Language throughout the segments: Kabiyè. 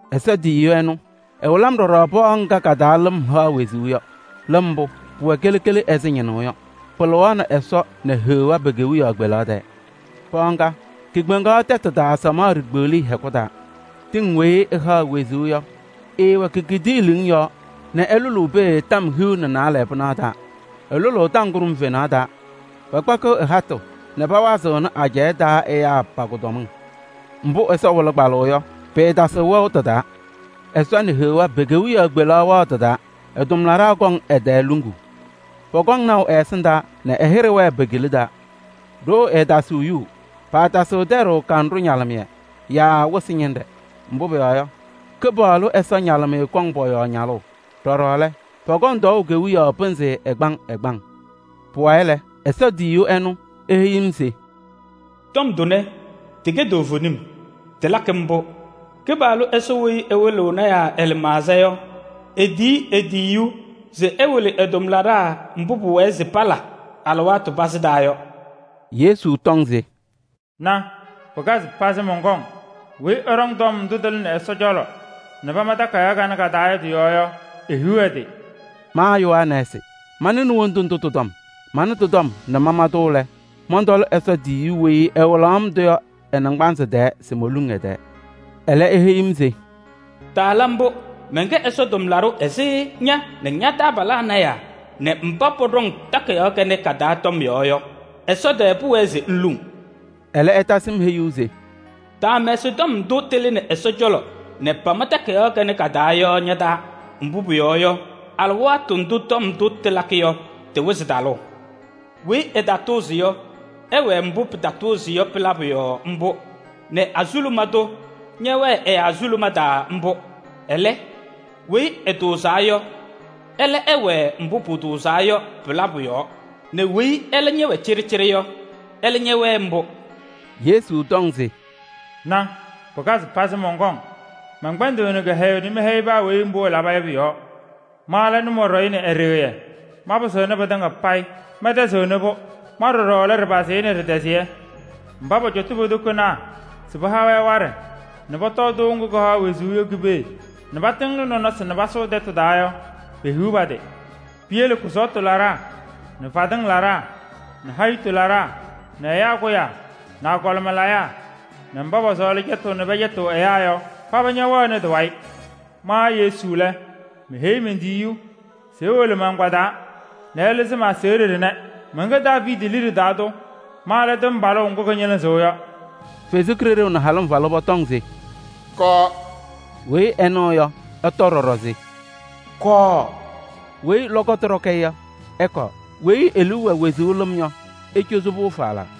Ɛsɔ tiyiyu ɛnʋ, ɛwɩlɩ-m ɖɔɖɔ pɔɔ ŋga ka-taa lɩm haɣ wezuu yɔ. Lɩm mbʋ, pʋwɛ kele kele ɛzɩ ñɩnʋʋ yɔ. Pɩlɩɣaɣnɩ Ɛsɔ nɛ Heɣa pe-kewiyaɣ kpelaɣ tɛɛ. Pɔɔ ŋga, kekpeŋaɣ tɛtʋ taa samaɣ ɖikpeɣliye hɛkʋ taa. Tɩŋ weyi ɩhaɣ wezuu yɔ, ɩɩwɛ ke-kidiilimiŋ yɔɔ nɛ ɩlʋlʋʋ pee tɔm hiu nɛ naalɛ pɩnaɣ taa. Ɩlʋlʋʋ tɔm kʋɖʋm fenaɣ taa. Pakpakɩɣ ɩ-hatʋ nɛ pawazɩɣnɩ ajɛɛ taa ɛyaa pa-kʋdɔmɩŋ. Mbʋ Ɛsɔ wɩlɩ kpalʋʋ yɔ, pɩɩtasɩɣ wɛʋ tɩ-taa. Ɛsɔ nɛ Heɣa pe-kewiyaɣ kpelaɣ wɛɣ tɩ-taa. Ɛ-tʋmlaɖaa kɔŋ ɛ-tɛɛ luŋuu. Pɔkɔŋ naʋ ɛ-ɛsɩndaa nɛ ɛ-hɩɖɛ wɛɛ pe-kila taa. Ɖoo ɛɛtasɩɣ yuu. Paatasɩɣ tɛɖʋʋ kanɖʋ ñalɩmɩyɛ yaa wɩsɩ ñɩnɖɛ, mbʋ pʋyɔɔ yɔ, Kɩpaɣlʋ Ɛsɔ ñalɩmɩyɛ kɔŋ pɔ-yɔɔ ñalʋʋ. Ɖɔɖɔ lɛ, pɔkɔŋ tɔɔʋ kewiyaɣ pɩnzɩ ɛgbaŋ ɛgbaŋ. Pʋwayɩ lɛ, Ɛsɔ tiyiyu ɛnʋ, eheyi-m se: “Tɔm tʋnɛ, tɩkɛ toovenim, tɩlakɩ mbʋ. Kɩpaɣlʋ Ɛsɔ weyi ɛwɩlɩɣ lɔɔyɩsɩ tɩnaa ɛ-lɩmaɣza yɔ, etiyi e-tiyiyu se ɛwɩlɩ ɛ-tʋmlaɖaa mbʋ pʋwɛɛ se pala alɩwaatʋ pazɩ taa yɔ.” Yesu tɔŋ se: “Na, pɩkazɩ pazɩ, mɔnkɔŋ! Weyi ɛɖɔŋ tɔm ndʋ tɩlɩnɩ Ɛsɔ cɔlɔ nɛ pama takayaɣ kanɛ ka-taa yɔ tɩ-yɔɔ yɔ, ehiɣ ɛ-tɩ!” Ma Yohanɛɛsɩ, manɩnɩ wondu ndʋ tɩ-tɔm. Manɩ tɩ-tɔm nɛ mana-tʋ lɛ, mɔntɔlɩ Ɛsɔ tiyiyu weyi ɛwɩlaɣ-m-tʋ yɔ ɛ-naŋgbanzɩ tɛɛ se moluŋ ɛ-tɛɛ. Ɛlɛ, eheyi-m se: “Taala mbʋ! Mɛnkɛ Ɛsɔ tʋmlaɖʋ ɛzɩ ña nɛ ña-taabalaa lɔɔyɩsɩ tɩnaa nɛ mba pɔɖɔŋ takayaɣ kanɛ ka-taa tɔm yɔɔ yɔ. Ɛsɔ tɛɛ pʋwɛɛ se ŋluŋ!” Ɛlɛ ɛtasɩ-m heyuu se: “Taamɛsɩ tɔm ndʋ tɩlɩnɩ Ɛsɔ cɔlɔ nɛ pama takayaɣ kanɛ ka-taa yɔ ña-taa. Mbʋ pʋyɔɔ yɔ, alɩwaatʋ ndʋ tɔm ndʋ tɩlakɩ yɔ, tɩwɩzɩ talʋʋ. Weyi ɛtatʋʋzɩ yɔ, ɛwɛɛ mbʋ pɩtatʋʋzɩ yɔ pɩ-labʋ yɔɔ mbʋ nɛ azuluma tʋ ñɛwɛɛ ɛ-azuluma taa mbʋ. Ɛlɛ, weyi ɛtʋʋzaa yɔ, ɛlɛ ɛwɛɛ mbʋ pʋtʋʋzaa yɔ pɩ-labʋ yɔɔ nɛ weyi ɛlɛ wɛ cɩɖɩcɩɖɩ yɔ, ɛlɛ ñɛwɛɛ mbʋ!” Yesu tɔŋ se: “Na! Pɩkazɩ pazɩ, mɔnkɔŋ! Mɛnkpɛnɖɩɣnɩ kɩhɛyʋʋ nɛ mɛhɛyɩ paa weyi mbʋ ɛlaba yɔ pʋ-yɔɔ. Ma lɛ Nʋmɔɖɛyʋ nɛ Ɛɖɩɣyɛ, manpazɩnɩ pɩtɩŋa payɩ, mɛntɛzɩɣnɩ-pʋ. Ma ɖɔɖɔ lɛ Ɖɩpazɩyɛ nɛ Ɖɩtɛzɩyɛ. Mba pɔcɔtʋʋ po-tokonaa se pɩha-wɛ waɖɛ nɛ pɔtɔɔ tɩʋ ŋgʋ kɩhaɣ wezuu yɔ ki-pee nɛ patɩŋnɩ nɔnɔsɩ nɛ pasʋʋ tɛtʋ taa yɔ, pehiɣ pa-tɩ! Piyele kʋsɔɔtʋ laɖaa nɛ fadɩŋ laɖaa nɛ hayitu laɖaa nɛ ɛyaa kʋyaa nɛ agɔlɩma layaa nɛ mba pɔsɔɔlɩ cɛtʋʋ nɛ pɛcɛtɩɣ ɛyaa yɔ, paba ñɛwɛɣnɩ tɩ-wayɩ! Ma Yesu lɛ, meheyi men-tiyiyu se ewolo ma-agbaa taa nɛ ɛlɩzɩ-mɩ aseɣɖe ɖɩnɛ. Mɛnkɛ Daaviidi liɖe taa tʋ, ma lɛ tɩmbalʋʋ ŋgʋ kɩñɩlɩzɩɣ yɔ.” Ɛsɔ Kalɩzaɣ nɛ Halɩmvalʋ pɔtɔŋ se: “Kɔɔ!” Weyi ɛnɩɣ yɔ, ɛtɔ ɖɔɖɔ se: “Kɔɔ!” Weyi lɔkɔtʋ ɖɔkɩ-ɩ yɔ, ɛkɔɔ: weyi e-liu wɛ wezuu lɩm yɔ, ecozi-pʋ falaa!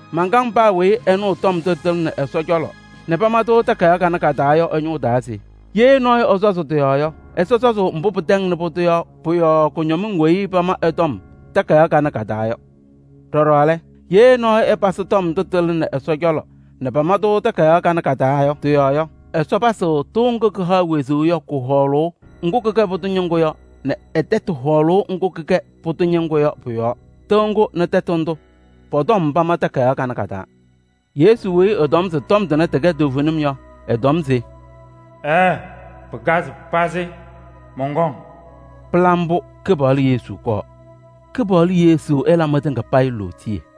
Mankaŋ paa weyi ɛnɩɣ tɔm ndʋ tɩlɩnɩ Ɛsɔ cɔlɔ nɛ pama-tʋ takayaɣ kanɛ ka-taa yɔ ɛ-ñʋʋ taa se: ye nɔɔyʋ ɛsɔzɩ tɩ-yɔɔ yɔ, Ɛsɔ sɔzʋʋ mbʋ pɩtɛŋnɩ pʋdʋ yɔ pʋ-yɔɔ kʋñɔmɩŋ weyi pama ɩ-tɔm takayaɣ kanɛ ka-taa yɔ. Ɖɔɖɔ lɛ, ye nɔɔyʋ ɛpasɩ tɔm ndʋ tɩlɩnɩ Ɛsɔ cɔlɔ nɛ pama-tʋ takayaɣ kanɛ ka-taa yɔ tɩ-yɔɔ yɔ, Ɛsɔ pasɩɣ tɩʋ ŋgʋ kɩhaɣ wezuu yɔ kʋ-hɔɔlʋʋ ŋgʋ kɩkɛ pʋdʋ ñɩŋgʋ yɔ nɛ ɛ-tɛtʋ hɔɔlʋʋ ŋgʋ kɩkɛ pʋdʋ ñɩŋgʋ yɔ pɔ-yɔɔ. Tɩʋ ŋgʋ nɛ tɛtʋ ndʋ pɔ-tɔm pama takayaɣ kanɛ ka-taa. Yesu weyi ɛtɔm se tɔm tʋnɛ tɩkɛ toovenim yɔ, ɛtɔm se: “Ɛɛ, pɩkazɩ pazɩ, mɔnkɔŋ.” Pɩla mbʋ! Kɩpaɣlʋ Yesu, kɔɔ! Kɩpaɣlʋ Yesu ɛla mɩtɩŋa payɩ lootiye!